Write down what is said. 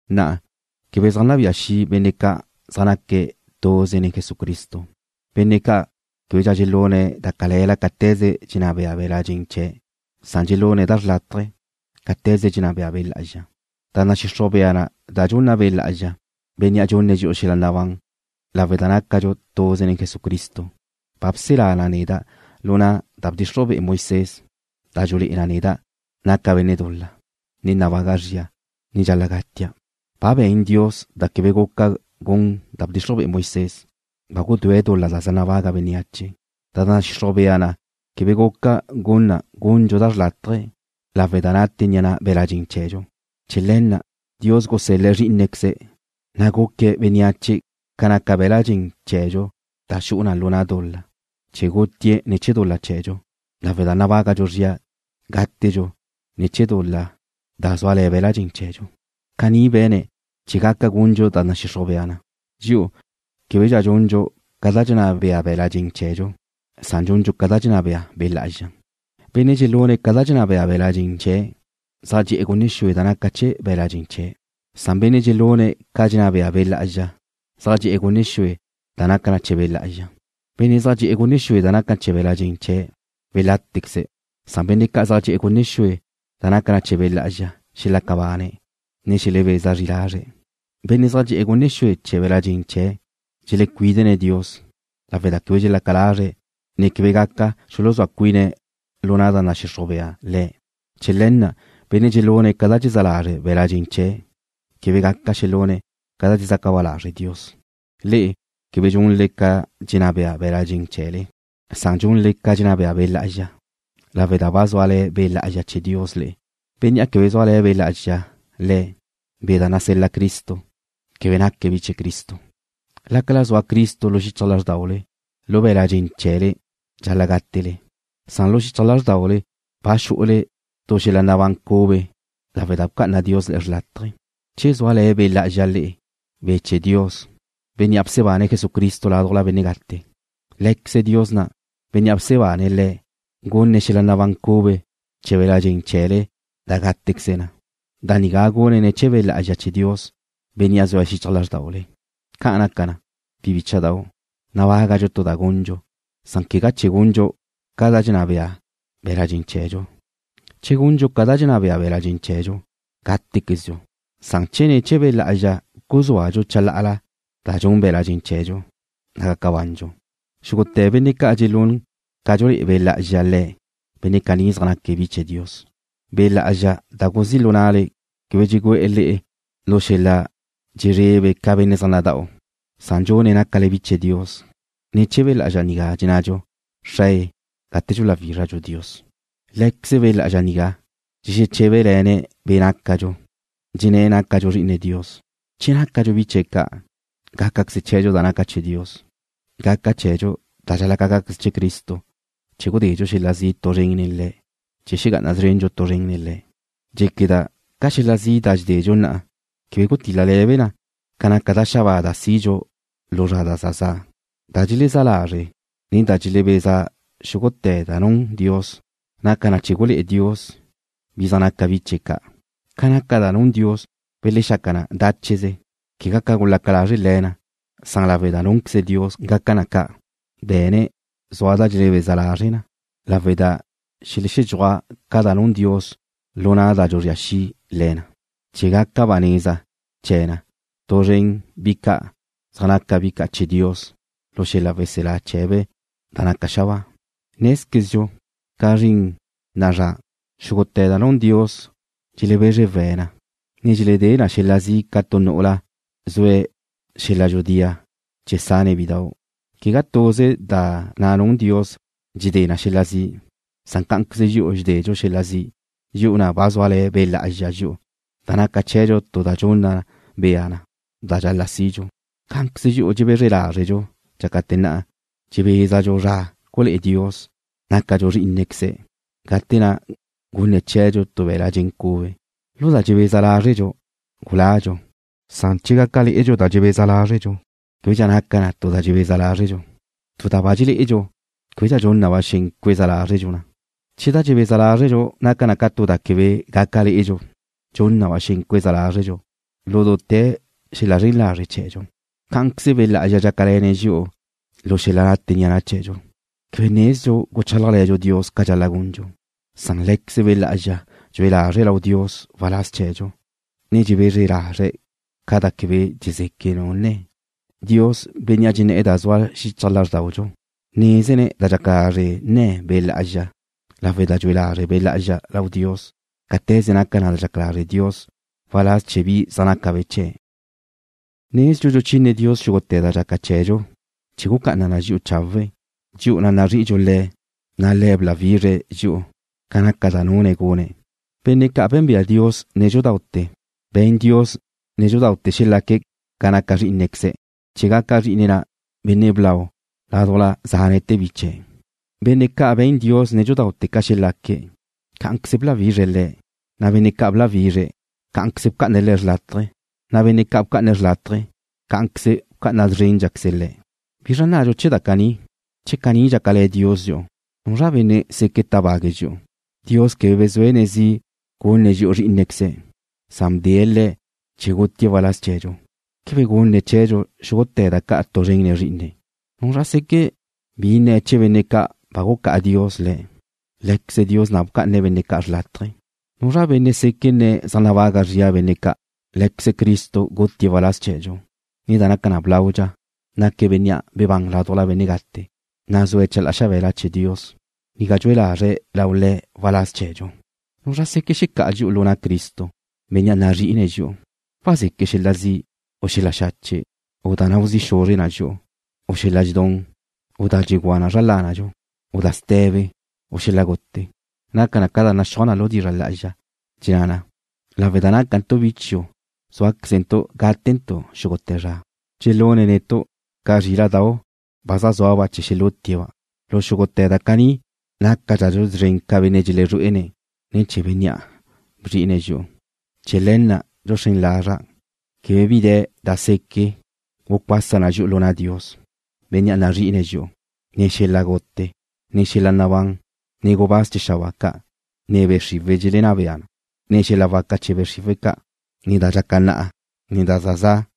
Na'a, quebe zaj nabía xi' benne' ca' zaj naque̱' tuze nen Jesucristo, benne' ca' québedxa dxelune̱' da cale̱la cáte̱ze dxenná bea be̱la' dxen chee̱', san dxelune̱' da xrlátaje cáte̱ze dxenná bea Be' Lá'azxa. Da nadxixruj bea na da dxunna Be' Lá'azxa, Bénnea' dxunne̱' dxi'u xel-la nabán lawe' da nácadxu tuze nen Jesucristo, ba bselá na neda' lu na' da bdxixruj be'e Moisés da dxulé'e na neda' naca' benne' dul-la, ne nabaga' zria, ne dxal-la' gatia'. Ba be̱n Dios da quebe guca gun da bdxixruj be'e Moisés, ba gudúe̱' dul-la da zaj nabaga bénneache. Da nadxixruj bea na quebe guca gun na gundxu da xrlátaje lawe' da nate ni'a na' be̱la' dxen chee̱dxu. Chee̱ le̱ na' Dios gusel-le̱' Zrí'inequeze̱', na' guque̱' bénneache ca naca be̱la' dxen chee̱dxu da xu'u na lu na' dul-la, chee̱ gutie̱' ne̱ chee̱ dul-la chee̱dxu, lawe' da nabágadxu zria gátedxu ne̱ chee̱ dul-la da zúale̱ be̱la' dxen chee̱dxu. Caní be̱ne̱' chee̱ gaca gundxu da nadxixruj bea na, dxi'u québedxa dxundxu ca dxenná bea be̱la' dxen chee̱dxu, san dxundxu ca dxenná bea Be' Lá'azxa. Benne' dxelune̱' ca dxenná bea be̱la' dxen chee̱' zaj dxe'e̱ gunne xue da naca chee̱ be̱la' dxen chee̱', san benne' dxelune̱' ca dxenná bea Be' Lá'azxa zaj dxe'e̱ gunne xue da naca chee̱ Be' Lá'azxa. Benne' zaj dxe'e̱ gunne xue da naca chee̱ be̱la' dxen chee̱' welátequeze̱', san benne' ca' zaj dxe'e̱ gunne xue da naca chee̱ Be' Lá'azxa xelaca bane̱', ne xelebeza zri lazre̱'. Benne' zaj dxe'e̱ gunne xue chee̱ be̱la' dxen chee̱' dxelecuídene̱' Dios, lawe' da quebe dxelaca lazre̱', ne quebe gaca xuluzúa cuine̱' lu na' da nadxixruj bea Le̱'. Chee̱ le̱ na' benne' dxelune̱' ca da dxezá lazre' be̱la' dxen chee̱' quebe gaca xelune̱' da dxezaca ba lazre' Dios. Le'e quebe dxunle ca dxenná bea be̱la' dxen chee̱le, san dxunle ca dxenná bea Be' Lá'azxa, lawe' da ba zúale̱ Be' Lá'azxa chee̱ Dios le'e. Benne' quebe zúale̱ Be' Lá'azxa le̱', Be' da nasel-la Cristo, quebe naque̱' bi chee̱ Cristo. Lácala zua Cristo lu xichaj lázrdaule, lu be̱la' dxen chee̱le dxal-la' gátele, san lu xichaj lázrdaule ba xu'ule tu xel-la nabán cube lawe' da bca'ana Dios le'e xrlátaje. Che zúale̱ Be' Lá'azxa le'e, Be' chee̱ Dios, Bénnea' bsebane̱' Jesucristo ládujla benne' gate, Lé̱queze Dios na', Bénnea' bsebane̱' Le̱', gunne̱' xel-la nabán cube chee̱ be̱la' dxen chee̱le da gátequeze na. Da nigá gune̱' ne̱ chee̱ Be' Lá'azxa chee̱ Dios, Bénnea' zue̱' xichaj lázrdaule. Ca' naca na, bi bícha'dau', nabágadxu tu da gundxu, san quegá chee̱ gundxu ca dxenná bea be̱la' dxen chee̱dxu. Che gundxu ca dxenná bea be̱la' dxen chee̱dxu, gátequezdxu, san che ne̱ chee̱ Be' Lá'azxa guzúadxu chalá'ala da dxun be̱la' dxen chee̱dxu, na' gaca bandxu. Xúgute̱ benne' ca' dxelún ca dxulé'e Be' Lá'azxa le̱', benne' caní zaj naque̱' bi chee̱ Dios. Be' Lá'azxa da guzí' lu na'le quebe dxugu'e̱ le'e lu xel-la dxezrebe ca benne' zaj nada'u, san dxune̱' nácale bi chee̱ Dios. Ne̱ chee̱ Be' Lá'azxa nigá dxenne̱dxu: “Xrae”, gate dxuláwizredxu Dios. Lé̱queze Be' Lá'azxa nigá dxexeché̱bele̱ne̱' be' nácadxu, dxenné̱' nácadxu bi chee̱ Dios. Che nácadxu bi chee̱' ca', gácaqueze chee̱dxu da naca chee̱ Dios. Gaca chee̱dxu da dxal-la' gaca chee̱ Cristo che gudedxu xel-la zi' tu zren nen Le̱', chee̱ xegá'ana szrendxu tu zren nen Le̱'. Dxéqueda' ca xel-la zi' da dxededxu na'a quebe gutíl-lele̱be na ca da xabáa da sidxu lu zra da za za'. Da dxelezá lazre', ne da dxelebeza xúgute̱ da nun Dios naca na chee̱ gulé'e Dios bi zaj naca be̱' bi chee̱' ca'. Ca naca da nun Dios belexaca na dácheze, quegá ca gulaca lazre' le̱ na, san lawe' da núnqueze Dios gaca na ca'. Be̱ne̱' zua da dxelebeza lazre na lawe' da xeledxúaj ca da nun Dios lu na' da dxuzría xi' le̱ na, chee̱ gaca ba neza chee̱ na tu zren nen bi ca' zaj naca bi ca' chee̱ Dios lu xel-la weselá chee̱be' da naca xabáa. Nézquezdxu, ca zrin na'a zra, xúgute̱ da nun Dios dxelebezre we̱' na, ne dxeledé na xel-la zi' ca tu nu'ula zue̱' xel-la dxudía chee̱ sane̱' bidau'. Quegá tuze da na' nun Dios dxedé na xel-la zi', san cá'anqueze dxi'u dxededxu xel-la zi', dxi'u na' ba zúale̱ Be' Lá'azxa dxi'u, da naca chee̱dxu tu da dxunna bea na da dxal-la' sidxu. Cá'anqueze dxi'u dxebezre lázredxu dxácate̱ na' dxebézadxu zra gulé'e Dios nácadxu bi chee̱' ca', gate na' gunne̱' cheedxu tu be̱la' dxen cube. Lu da dxebeza lázredxu guládxu, san che gaca lé'edxu da dxebeza lázredxu, québedxa naca na tu da dxebeza lázredxu. Tu da ba dxelé'edxu, québedxa dxun na ba xen cueza lázredxu na. Che da dxebeza lázredxu naca na tu da quebe gaca lé'edxu, dxun na ba xen cuézadxu na lu dute̱ xel-la zren lazre' chee̱dxu. Cá'anqueze Be' Lá'azxa dxácale̱ne̱' dxi'u lu xel-la nate ni'a na' chee̱dxu. Quebe nezdxu guchálajle̱dxu Dios ca dxal-la' gundxu, san Lé̱queze Be' Lá'azxa dxue lazre̱' lau Dios waláz chee̱dxu, ne dxebezre lazre̱' ca da quebe dxezeque' nu nne̱. Dios, Bénnea' dxenné̱'e̱ da zua xichaj lázrdaudxu nézene̱' da dxaca lazre' nne̱ Be' Lá'azxa lawe' da dxue lazre' Be' Lá'azxa lau Dios cáte̱ze naca da dxaca lazre' Dios waláz chee̱ bi zaj naca be̱' chee̱'. Nezdxu dxuchine Dios xúgute̱ da dxaca chee̱dxu chee̱ gucá'ana na dxi'u chawe', dxi'u na' nazri'idxu Le̱', na' Le̱' bláwizre̱' dxi'u ca naca da nune̱' gune̱'. Benne' ca' bénbea Dios nédxudaute̱, be̱n Le̱' nédxudaute̱ xelaque̱' ca naca Zrí'inequeze̱', chee̱ gaca Zrí'ine̱' na' Benne' blau ládujla zánete̱ bi biche̱'. Benne' ca' be̱n Dios nédxudaute̱ ca xelaque̱', cá'anqueze bláwizre̱' le̱', na' benne' ca' bláwizre̱', cá'anqueze bca'ane̱' le̱' xrlátaje, na' benne' ca' bca'ane̱' xrlátaje, cá'anqueze bca'ana szrénqueze̱' le̱'. ¿Bizra nnadxu chee̱ da caní? Che caní dxácale̱ Dios dxi'u, ¿nuzra benne' seque' tábague̱' dxi'u? Dios quebe bezúene̱' zi' gunne̱' dxi'u Zrí'inequeze̱', san bdee̱' Le̱' chee̱ gútie̱' waláz chee̱dxu. ¿Quebe gunne̱' chee̱dxu xúgute̱ da ca' tu zren nen Zrí'ine̱'? ¿Nuzra seque' bi nne̱ chee̱ benne' ca' ba gucá'a Dios le̱'? Lé̱queze Dios na' bca'ane̱' benne' ca' xrlátaje. ¿Nuzra benne' seque' nne̱' zaj nabaga zria benne' ca'? Lé̱queze Cristo gutie̱' waláz chee̱dxu, ne da naca na blaudxa, naque̱' Bénnea' bebán ládujla benne' gate, na' zue̱' chalá'a xabe̱la chee̱ Dios, ga dxue lazre̱' lau Le̱' waláz chee̱dxu. ¿Nuzra seque' xecá'a dxi'u lu na' Cristo, Bénnea' nazrí'ine̱' dxi'u? ¿Wazeque' xel-la zi', u xel-la xache', u da nau zi' xuzre na dxi'u, u xel-la dxedún, u da dxugúa zra lánadxu, u da ste̱be, u xel-la gute? Naca na ca da naxúaj na lu dizra' lá'azxa, dxenná na: Lawe' da nácantu' bi chiu' zúaquezentu' gátentu' xúgute̱ zra. Dxelune̱' netu' ca zríla'dau' ba zaj zúaba' chee̱ xelútie̱'-ba'. Lu xúgute̱ da caní nácadxadxu szren ca benne' dxelezrué'ene̱', ne̱ chee̱ Bénnea' bzri'ine̱' dxi'u. Chee̱ le̱ na' dxuxrén lazra' quebe bi de̱ da seque' gucuasa na dxi'u lu na' Dios, Bénnea' nazrí'ine̱' dxi'u. Ne xel-la gute, ne xel-la nabán, ne gubáz chee̱ xabáa ca', ne be' xriwe̱' dxelenná bea, ne xel-la waca chee̱ be' xriwe̱' ca', ne da dxaca na'a, ne da za za',